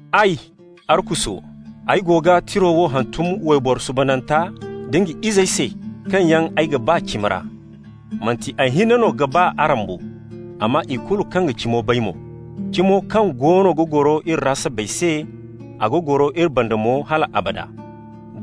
Ay, Arkuso, ay go ga tiro wo hantum wayboro suubananta da nga izey se kaŋ yaŋ ay ga ba cimi ra. Manti ay hinne no ga ba araŋ bo, amma ikulu kaŋ ga cimo bay mo, cimo kaŋ goono ga goro iri ra sabbay se, a ga goro iri banda mo hal abada.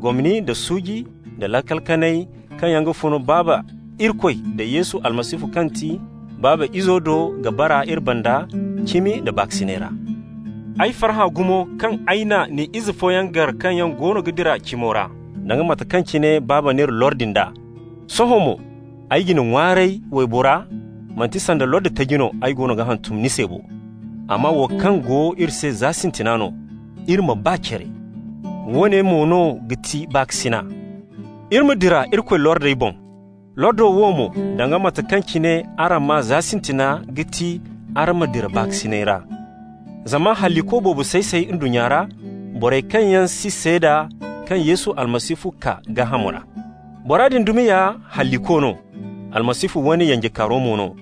Gomni nda suuji nda laakal kanay kaŋ yaŋ ga fun Baaba Irikoy da Yesu Almasihu kaŋ ti Baaba Izo do ga bara iri banda, cimi nda baakasinay ra. Ay farhã gumo kaŋ ay na ni ize fooyaŋ gar kaŋ yaŋ goono ga dira cimo ra, danga mate kaŋ cine Baaba n'iri lordi nd'a. Sohõ mo ay ga ni ŋwaaray, waybora, manti sanda lordi taji no ay goono ga hantum ni se bo, amma wo kaŋ go iri se za sintina no: iri ma ba care. Woone mo no ga ti baakasina: iri ma dira Irikoy lordey boŋ. Lordo wo mo, danga mate kaŋ cine araŋ maa za sintina, ga ti araŋ ma dira baakasinay ra. Zama halliko boobo say-say ndunnya ra, borey kaŋ yaŋ si seeda kaŋ Yesu Almasihu kaa gaaham ra. Bora din dumi ya halliko no, Almasihu wane yanjekaari mo no.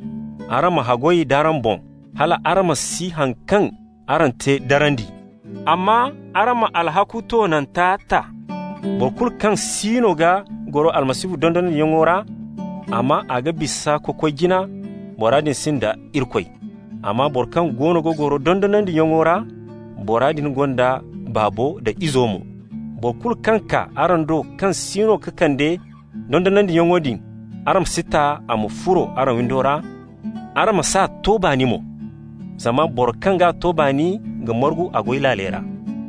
Araŋ ma haggoy d'araŋ boŋ hal araŋ ma si haŋ kaŋ araŋ te darandi, amma araŋ ma alhakku toonanta ta. Boro kulu kaŋ siino ga goro Almasihu dondonandiyaŋo ra, amma a ga bisa ka koy jina, bora din sinda Irikoy. Amma boro kaŋ goono ga goro dondonandiyaŋo ra, bora din gonda Baabo da Izo mo. Boro kulu kaŋ kaa araŋ do kaŋ siino ga kande dondonandiyaŋo din, araŋ ma si ta a ma furo araŋ windo ra, araŋ ma s'a to baani mo. Zama boro kaŋ g'a to baani ga margu a goy laaley ra.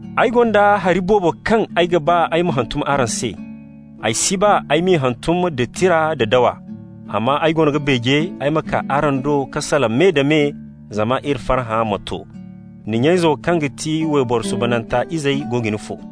Ay gonda hari boobo kaŋ ay ga ba ay ma hantum araŋ se. Ay si ba ay m'i hantum da tira nda dawa, amma ay goono ga beeje ay ma kaa araŋ do ka salaŋ me-da-me, zama iri farhã ma to. Ni nya-izo kaŋ ga ti wayboro suubananta izey go ga ni fo.